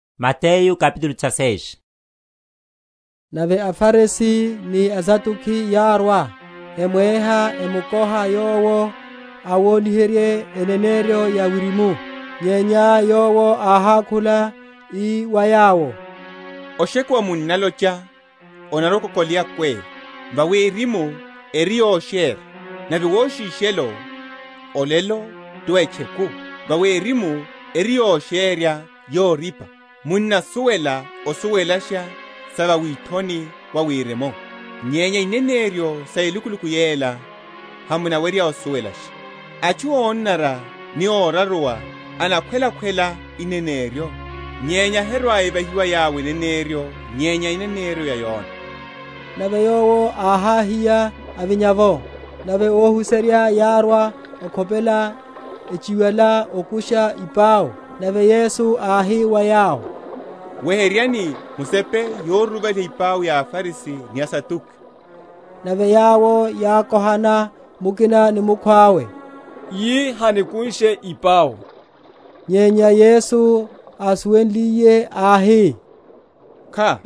Yoruruvaliha epau ya aFarisi. Nave aFarisi ni aSaduki yárwa, emweha, emkoha Yowo awoniherye eneneryo ya Wirimu. Nyenya Yowo áhákhula, ii wa yawo, Oshekuwa munnalocha, Onarwa‐okokoleya kwee: vawi erimu eri yosherya. Nave woshishelo, Olelo ti wa’tcheku: vawi erimu eri yosherya yorípa. Munnasuwela osuwelasha sa va withoni wa erimu; nyenya ineneryo sa elukuluku yela, hamunawerya osuwelasha. Atchu ónanara ni óraruwa enakhwelakhwela eneneryo; nyenya herwa‐evahiwa wa yawo eneneryo nyenya eneneryo ya Yona. Nave Yowo áháhiya, avinya’vo. Nave ohuserya yárwa okhopela, echiwala okusha ipau. Nave Yesu áhi wa yawo, Weheryani musepe yoruruvaliha ipau ya aFarisi ni aSaduki. Nave yawo yákohana mukina ni mukhwawe, yi Hanikunshe ipau. Nyenya Yesu, ásuwenliye, áhi, Kha,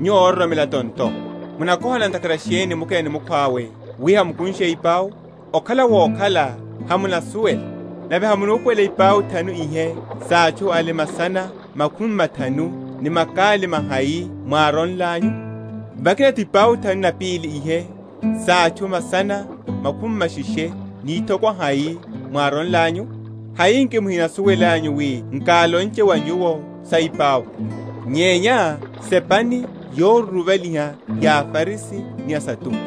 nyuwo ororomela tonto, munakohana ntakhara sheni mukina ni mukhwawe, wi hamukunshe ipau? okhala wokhala hamunasuwela, nave hamunupuwela ipau thanu ihe sa atchu ale masana makhumi mathanu, ni makali mahai mwáronlanyu? Vakina’tho ipau thanu na pili ihe sa atchu masana makhumi masheshe ni ithokwa hai mwáronlanyu? Hai nki muhinasuwelanyu wi nkálonche wa nyuwo sa ipau? Nyenya sepani yoruruvaliha ya aFarisi ni aSaduki.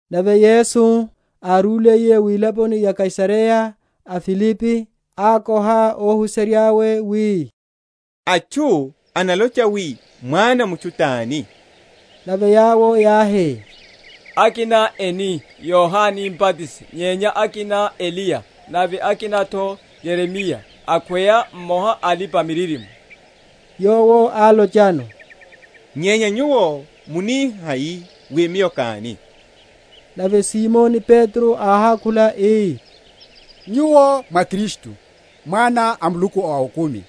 Nave Yesu, arúliye wilaponi ya o Kaisareya a Filipi, ákoha óhuserya’we, wi, Atchu enalocha wi Mwana a mutchu tani? Nave yawo yáhi, Akina eni, Yohane Mbatisi; nyenya akina, Eliya: nave akina’tho Yeremiya, akhweya mmoha a alipa‐miririmo. Yowo álochano, Nyenya nyuwo munihai wi Miyo káni? Nave Simoni Petro áhákhula ii, Nyuwo mwá Kristu, Mwana a Muluku a okumi.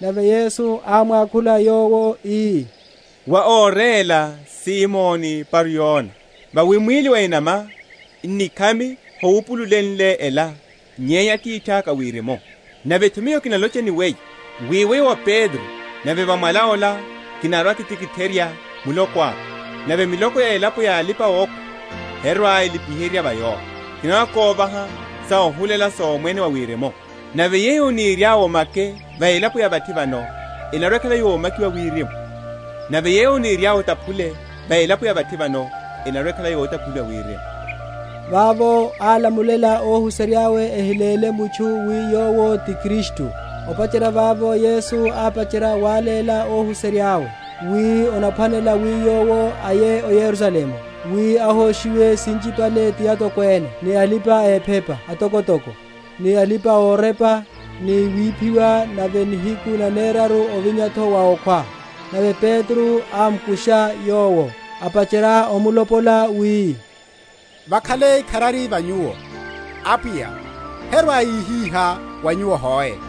Nave Yesu ámwakhula yowo, ii, Wá óréla, Simoni Bar‐Yona: vawi mwíli wa enama, n’nikhami howupululenle ela, nyenya Atithaka a Wirimu. Nave’tho Miyo kinalocha ni weyo, wi weyo wá Petro, nave va mwala ola kinarwa‐kitikitherya Muloko aka: nave milako ya elapo ya alipa‐okhwa herwa‐elipiherya va yowo. Kinarwa‐kovaha sohulela sa Omwene wa Wirimu: nave yeyo oniryá omake va elaponi ya vathi vano, enarwa‐ekhala yomakiwa Wirimu: nave yeyo oniryá otaphule va elaponi ya vathi vano, enarwa‐ekhala yotaphuliwa Wirimu. Vavo álamulela óhuserya’we ehiléle mutchu wi Yowo ti Kristu. Opacherya vavo Yesu ápacherya wáléla óhuserya’we, wi onaphwanela wi Yowo aye o Yerusalemu, wi ahoshiwe sinchipale ti atokwene, ni alipa‐ephepa atokotoko, ni alipa‐orepa, ni wiphiwa, nave nihiku naneraru, ovinya’tho wa okhwa. Nave Petro ámkusha Yowo, apacherya omlopola, wi, Vakhale ikharari va Nyuwo, Apwiya: herwa‐yihihá wa Nyuwo hoe.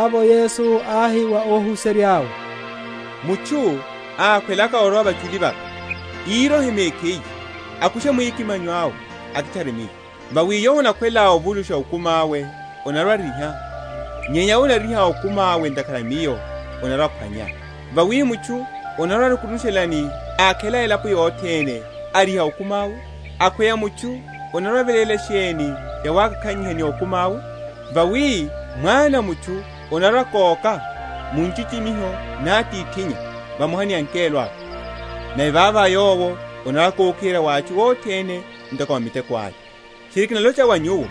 Vavo Yesu áhi wa óhuserya’we, Mutchu ákhwelaka orwa vachuli vaka, írohe mekhiye, akushe mwikimanyo awe, akitchare Miyo. Vawi yowo anakhwela ovulusha okumi awe anarwa‐ariha: nyenya yowo anariha okumi awe ntakhara a Miyo anarwa‐aphwanya. Vawi mutchu anarwa‐arukunushelani, ákhela elapo yothene, ariha okumi awe? akhweya mutchu anarwa‐aveléla sheni yawakakhanyiha ni okumi awe? Vawi Mwana a mutchu anarwa‐akóka, mu nchichimiho ra Atithinnya, vamoha ni angelo awe; nave vavo Yowo anarwa‐akokiherya wa atchu othene, ntoko miteko aya. Tchiri kinalocha wa nyuwo,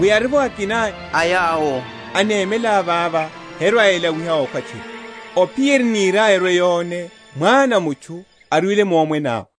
wi arivo akina a yawo enemela vava herwa‐elawiha okhwa tchiri, ophiyerya eniriaya erwe‐yone Mwana a mutchu arwile mu Omwene awe.